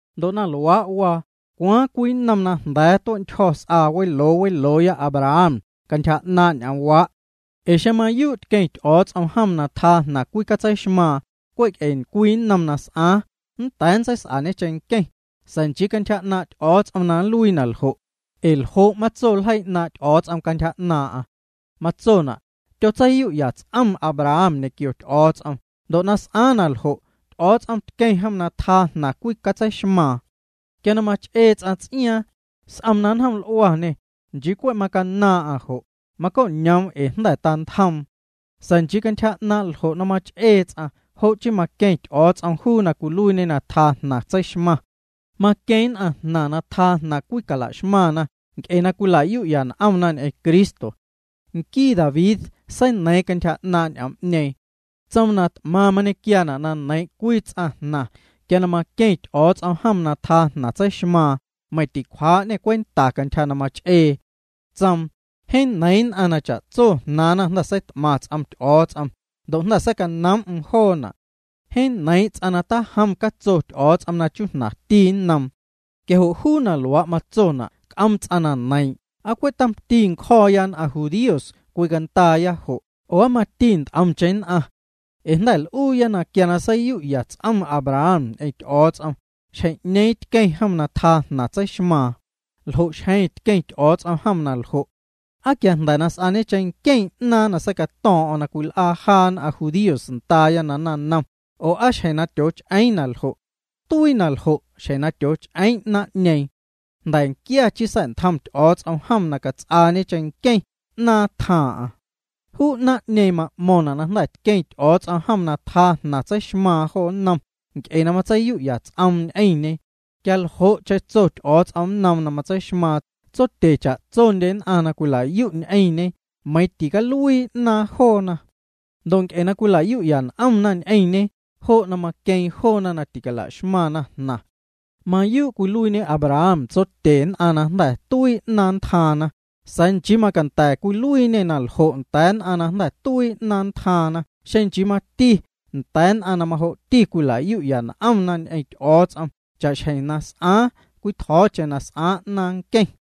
Ndo' na luaa' waa, ¿cwaaⁿ cwii nnom na jnda̱a̱ tue'ntyjo̱ s'aa weloo welooya Abraham cantyja 'naaⁿ' ñ'oomwaa'? Ee xeⁿ mayuu' tqueⁿ Ty'o̱o̱ts'om jom na tjaa jnaⁿ cwicatseixmaaⁿ cwe' ee cwii nnom na s'aaⁿ, nnda̱a̱ nntseis'añe cheⁿnqueⁿ, sa̱a̱ nchii cantyja 'naaⁿ' Ty'o̱o̱ts'om na nluii na ljo'. Ee ¿ljo' matso ljeii 'naaⁿ' Ty'o̱o̱ts'om cantyja 'naaⁿ'aⁿ? Matsona': “Tyotseiyu'ya ts'om Abraham ñequio Ty'o̱o̱ts'om, ndo' na s'aaⁿ naljo', Ty'o̱o̱ts'om tqueⁿ jom na tjaa jnaⁿ cwicatseixmaaⁿ.” Quia na mach'ee ts'aⁿ ts'iaaⁿ, s'om na nnjoml'uañê, nchii cwe' na macanaaⁿ'aⁿ jo', macoñoom ee jnda̱ tantjoom. Sa̱a̱ nchii cantyja ljo' na mach'ee ts'aⁿ, jo' chii maqueⁿ Ty'o̱o̱ts'om juu na cwiluiiñe na tjaa jnaⁿ tseixmaⁿ. Maqueeⁿ nn'aⁿjnaⁿ na tjaa jnaⁿ cwicalaxmaⁿna nc'e na cwilayu'ya n'omna ñ'eⁿ Cristo. Nquii David, seineiiⁿ cantyja 'naaⁿ' ñ'oom'ñeeⁿ. Tsoom na t'maⁿ mañequiaana' na neiiⁿ' cwii ts'aⁿjnaⁿ quia maqueⁿ Ty'o̱o̱ts'om jom na tjaa jnaⁿ tseixmaaⁿ, meiⁿ ticwjaa'ñê cwenta cantyja na mach'ee. Tsoom: Jeeⁿ neiiⁿ nn'aⁿ na cha'tso jnaaⁿna jnda̱ seit'maⁿ ts'om Ty'o̱o̱ts'om, ndo' jnda̱ seicanoom'm joona'. Jeeⁿ neiiⁿ' ts'aⁿ na tajom catso Ty'o̱o̱ts'om na chujnaⁿti nnoom. Quia jo' juu na luaa' matsona' nnc'om ts'aⁿ na neiiⁿ'eⁿ ¿aa cwe' tomti ncjo̱o̱ nn'aⁿ judíos cwicandaaya jo' oo aa mati nt'omcheⁿ nn'aⁿ? Ee jnda̱ l'uuya quia na seiyu'ya ts'om Abraham ñ'eⁿ Ty'o̱o̱ts'om, xjeⁿ'ñeeⁿ tqueⁿ jom na tjaa jnaⁿ tseixmaaⁿ. ¿Ljo' xjeⁿ tqueⁿ Ty'o̱o̱ts'om jom na ljo'? ¿Aa quia jnda̱ na s'aañe cheⁿnqueⁿ 'naaⁿ na seicato̱o̱ⁿ'o̱ⁿ na cwil'aa jaa nn'aⁿ judíos ndaaya na naⁿnom, oo aa xjeⁿ na tyooch'eeⁿ na ljo'? Tuii na ljo' xjeⁿ na tyooch'eeⁿ 'naaⁿ'ñeeⁿ. Jnda̱nquia chii sa̱'ntjom Ty'o̱o̱ts'om jom na cats'aañe cheⁿnqueⁿ 'naaⁿ tjaaⁿ'aⁿ. Juu 'naaⁿ'ñeeⁿ ma'mo̱ⁿna' na jnda̱ tqueⁿ Ty'o̱o̱ts'om jom na tjaa jnaⁿ tseixmaaⁿ jo nnom nc'e na matseiyu'ya ts'oom ñ'eⁿñe. Quia ljo'cheⁿ tso Ty'o̱o̱ts'om nnoom na nntseixmaaⁿ tsotye cha'tsondye nn'aⁿ na cwilayu' ñ'eⁿñe meiiⁿ ticaluii 'naaⁿ joona. Ndo' nc'e na cwila'yu'ya n'omna ñ'eⁿñe, jo' na maqueⁿ joona na ticala'xmaⁿna jnaⁿ. Mayuu' cwiluiiñe Abraham tsotye nn'aⁿ na jnda̱ tuii 'naaⁿ ntjaaⁿna, sa̱a̱ nchii macanda̱ cwiluiiñê na ljo' nda̱a̱ nn'aⁿ na jnda̱ tuii 'naaⁿ ntjaaⁿ xeⁿ nchii mati nda̱a̱ nn'aⁿ na majo'ti cwila'yu'ya n'omna ñ'eⁿ Ty'o̱o̱ts'om cha'xjeⁿ na s'aaⁿ cwitjo̱o̱cheⁿ na s'aaⁿ 'naaⁿ nqueⁿ.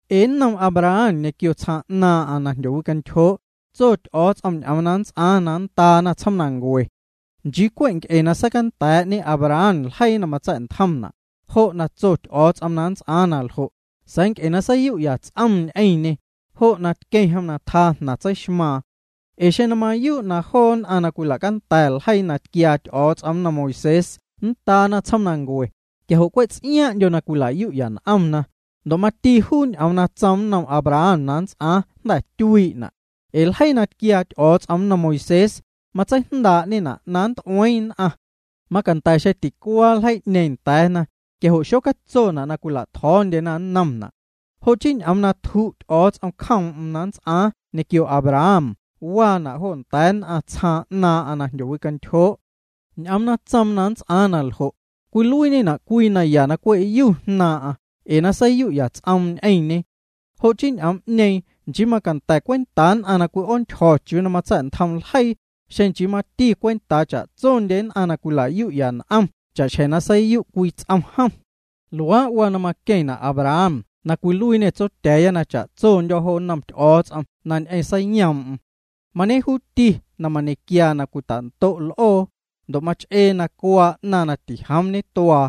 Ee nnom Abraham ñequio tsjaaⁿ 'naaⁿ'aⁿ na jndyowicantyjoo' tso Ty'o̱o̱ts'om ñ'oom na nnts'aaⁿ na nndaana tsjoomnancue. Nchii cwe' nc'e na seicanda̱a̱'ñe Abraham ljeii na matsa̱'ntjomna', jo' na tso Ty'o̱o̱ts'om na nnts'aaⁿ na ljo', sa̱a̱ nc'e seiyu'ya ts'om ñ'eⁿñê, jo' na tqueⁿ jom na tjaa jnaⁿ tseixmaaⁿ. Ee xeⁿ na mayuu' na joo nn'aⁿ na cwila'canda̱ ljeii na tquiaa Ty'o̱o̱ts'om nnom Moisés nndaana tsjoomnancue, quia jo' cwe' ts'iaaⁿ'ndyo na cwila'yu'ya n'omna, ndo' mati juu ñ'oom na tsoom nnom Abraham na nnts'aaⁿ jnda̱ tyuii'na'. Ee ljeii na tquiaa Ty'o̱o̱ts'om nnom Moisés, matseijndaa'ñena' na nnt'ueeⁿ nn'aⁿ. Macanda̱ xeⁿ ticuaa ljeii'ñeeⁿ nda̱a̱na, quia jo' xocatsona' na cwila'tjo̱o̱ndyena nnomna'. Jo' chii ñ'oom na tju' Ty'o̱o̱ts'om nacjoom'm na nnts'aaⁿ ñequio Abraham waana' jo nda̱a̱ nn'aⁿ tsjaaⁿ 'naaⁿ'aⁿ na jndyowicantyjoo'. Ñ'oom na tsoom na nnts'aaⁿ na ljo', cwiluiiñena' cwii naya na cwe'yu jnaaⁿ'aⁿ ee na seiyu'ya ts'oom ñ'eⁿñe. Jo' chii ñ'oom'ñeeⁿ nchii macanda̱ cwentaa nn'aⁿ na cwi'oontyjo̱ chiuu matsa̱'ntjom ljeii, xeⁿ nchii mati cwentaa cha'tsondye nn'aⁿ na cwila'yu'ya n'omna cha'xjeⁿ na tyotseiyu' cwii ts'om jom. Luaa' waa na maqueⁿna' Abraham na cwiluiiñê tsotya̱a̱ya na cha'tsondyo̱ jo nnom Ty'o̱o̱ts'om na ñ'eⁿ seiyoom'm. Mañejuuti na mañequiaa na cwitando'xco l'oo, ndo' mach'ee na cuaa 'naⁿ na tijoom ñetuaa.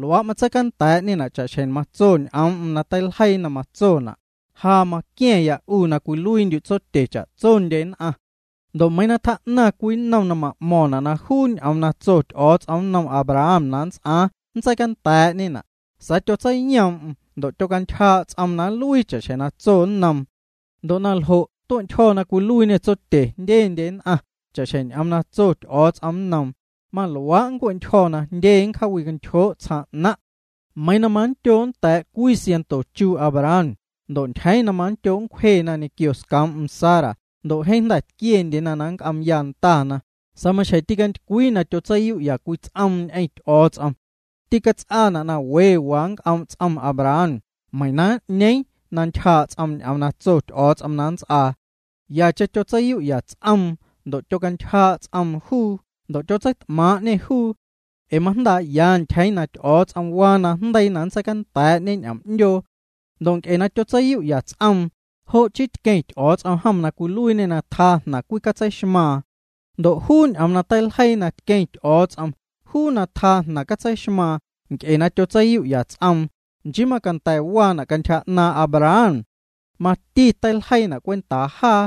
Luaa' matseicanda̱a̱'ñena' cha'xjeⁿ matso ñ'oom'm na teiljeii na matsona': “Ja maquia̱ⁿya 'u na cwiluiindyu' tsotye cha'tsondye nn'aⁿ.” Ndo' meiiⁿ na tjaa'naⁿ cwii nnom na m'mo̱ⁿna' na juu ñ'oom na tso Ty'o̱o̱ts'om nnom Abraham na nnts'aaⁿ nntseicanda̱a̱'ñena', sa̱a̱ tyotseiyoom'm ndo' tyocantyjaa' ts'oom na nluii cha'xjeⁿ na tso nnoom. Ndo' na ljo' tue'ntyjo̱ na cwiluiiñê tsotye jndyendye nn'aⁿ cha'xjeⁿ ñ'oom na tso Ty'o̱o̱ts'om nnoom: “Maluaa' nncue'ntyjo̱ na jndye nncjaawicantyjoo' tsjaaⁿ 'naⁿ'.” Meiiⁿ na manndyoo' nnda̱a̱' cwii sianto chuu' Abraham, ndo' ntyjeeⁿ na manndyoo' na nncwjena ñequio scoom'm Sara ndo' jeeⁿ jnda̱ tquiendyena na nnc'oomya ndana, sa̱a̱ maxjeⁿ ticantycwii na tyotseiyu'ya cwii ts'oom ñ'eⁿ Ty'o̱o̱ts'om. Tîcats'aana' na we waa nnc'oom' ts'om Abraham meiⁿ na n'ñeeⁿ na ntyjaa' ts'oom ñ'oom na tso Ty'o̱o̱ts'om na nnts'aa. Yacheⁿ tyotseiyu'ya ts'oom ndo' tyocantyjaa' ts'oom juu ndo' tyotseit'maaⁿ'ñê juu, ee majndaa'ya ntyjeeⁿ na Ty'o̱o̱ts'om waa najndeii na nntseicanda̱a̱'ñe ñ'oom'ndyoo. Ndo' nc'e na tyotseiyu'ya ts'oom, jo' chii tqueⁿ Ty'o̱o̱ts'om jom na cwiluiiñê na tjaa jnaⁿ cwicatseixmaaⁿ. Ndo' juu ñ'oom na teiljeii na tqueⁿ Ty'o̱o̱ts'om juu na tjaa jnaⁿ cwicatseixmaⁿ nc'e na tyotseiyu'ya ts'om, nchii macanda̱ waana' cantyja 'naaⁿ' Abraham. Mati teiljeiina' cwentaa jaa.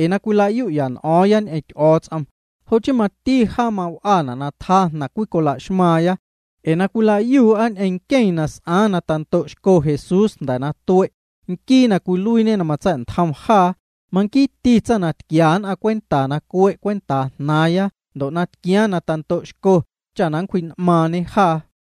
Ee na cwila'yu'ya n'o̱o̱ⁿya ñ'eⁿ Ty'o̱o̱ts'om, jo' chii mati jaa maw'ana' na tjaa jnaⁿ cwicola'xmaaⁿya, ee na cwila'yuu'a ñ'eⁿ nqueⁿ na s'aaⁿ na tando'xco Jesús jnda̱ na tue', nquii na cwiluiiñe na matsa̱'ntjom jaa, manquiiti tsaⁿ na tquia nn'aⁿ cwenta na cue' cwentaa' jnaaⁿya ndo' na tquiaaⁿ na tando'xco cha nncwji'n'maaⁿñe jaa.